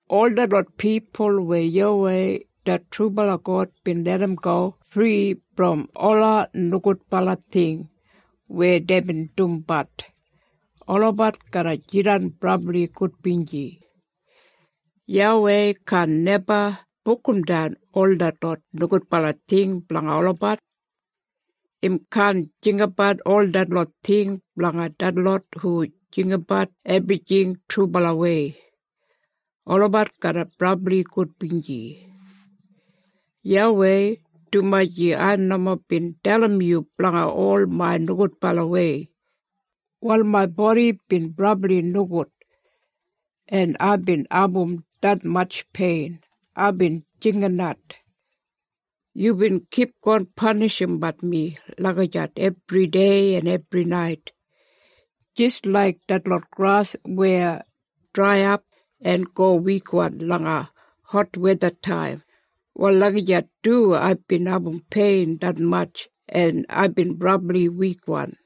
Ol detlot pipul weya YAWEI det trubala God bin larramgo fri brom ola nogudbala ting weya deibin dumbat, olabat garra jidan brabli gudbinji. YAWEI kaan neba bukumdan ol detlot nogudbala ting blanga olabat. Im kaan jinggabat ol detlot ting blanga detlot hu jinggabat ebrijing trubalawei. Olabat garra brabli gudbinji. YAWEI, dumaji ai nomo bin dalim yu blanga ol main nogudbalawei, wal main bodi bin brabli nogud, en aibin abum detmatj pein aibin jinginat. Yubin kipgon panishimbat mi lagijat ebridei en ebrinait. Jis laik detlot gras weya draiyap en go wikwan langa hotwethataim, wal lagijat du aibin abum pein detmatj en aibin brabli wikwan.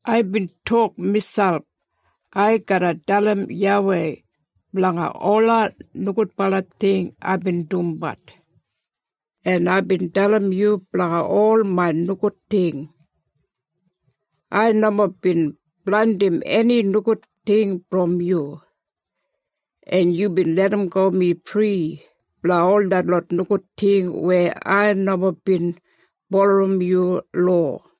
Aibin tok miselp, “Ai garra dalim YAWEI blanga ola nogudbala ting aibin dumbat.” En aibin dalim yu blanga ol main nogud ting. Ai nomo bin blandim eni nogud ting brom yu. En yubin larramgo mi fri blanga ol detlot nogud ting weya ai nomo bin bulurrum yu lowa.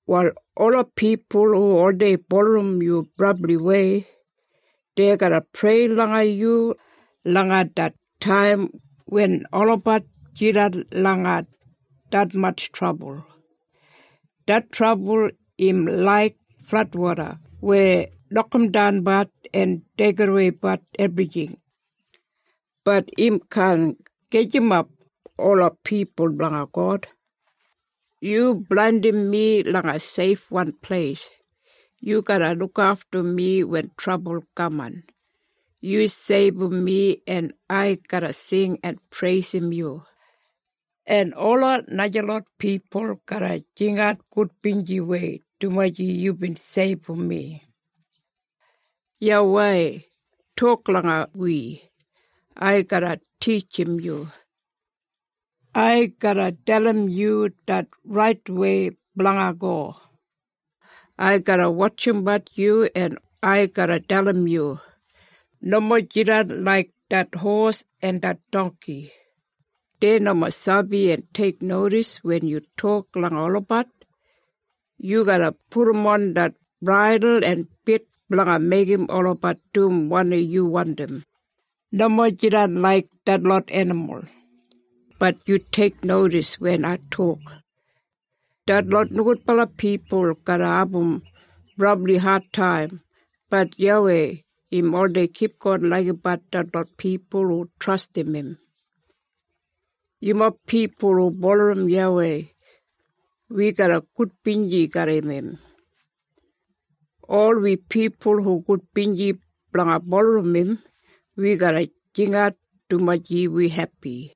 Wal ola pipul hu oldei bulurrum yu brabliwei, dei garra prei langa yu langa det taim wen olabat jidan langa detmatj trabul. Det trabul im laik fladwoda weya nokamdanbat en deigidaweibat ebrijing, bat im kaan gajimap ola pipul blanga God. Yu blandim mi langa seifwan pleis. Yu garra lukaftum mi wen trabul kaman. Yu seibum mi en ai garra sing en preisim yu, en ola najalot pipul garra jingat gudbinjiwei dumaji yubin seibum mi. YAWEI tok langa wi, “Ai garra titjim yu. Ai garra dalim yu det raitwei blanga go. Ai garra wotjimbat yu en ai garra dalim yu. Nomo jidan laik det hos en det dongki. Dei nomo sabi en teiknodis wen yu tok langa olabat. Yu garra pudumon det braidul en bit blanga meigim olabat dum wanim yu wandim. Nomo jidan laik detlot enimul, bat yu teiknodis wen ai tok.” Detlot nogudbala pipul garra abum brabli adtaim, bat YAWEI im oldei kipgon laigimbat detlot pipul hu trastim im. Yumob pipul hu bulurrum YAWEI, wi garra gudbinji garram im. Ol wi pipul hu gudbinji blanga bulurrum im, wi garra jinginat dumaji wi hepi.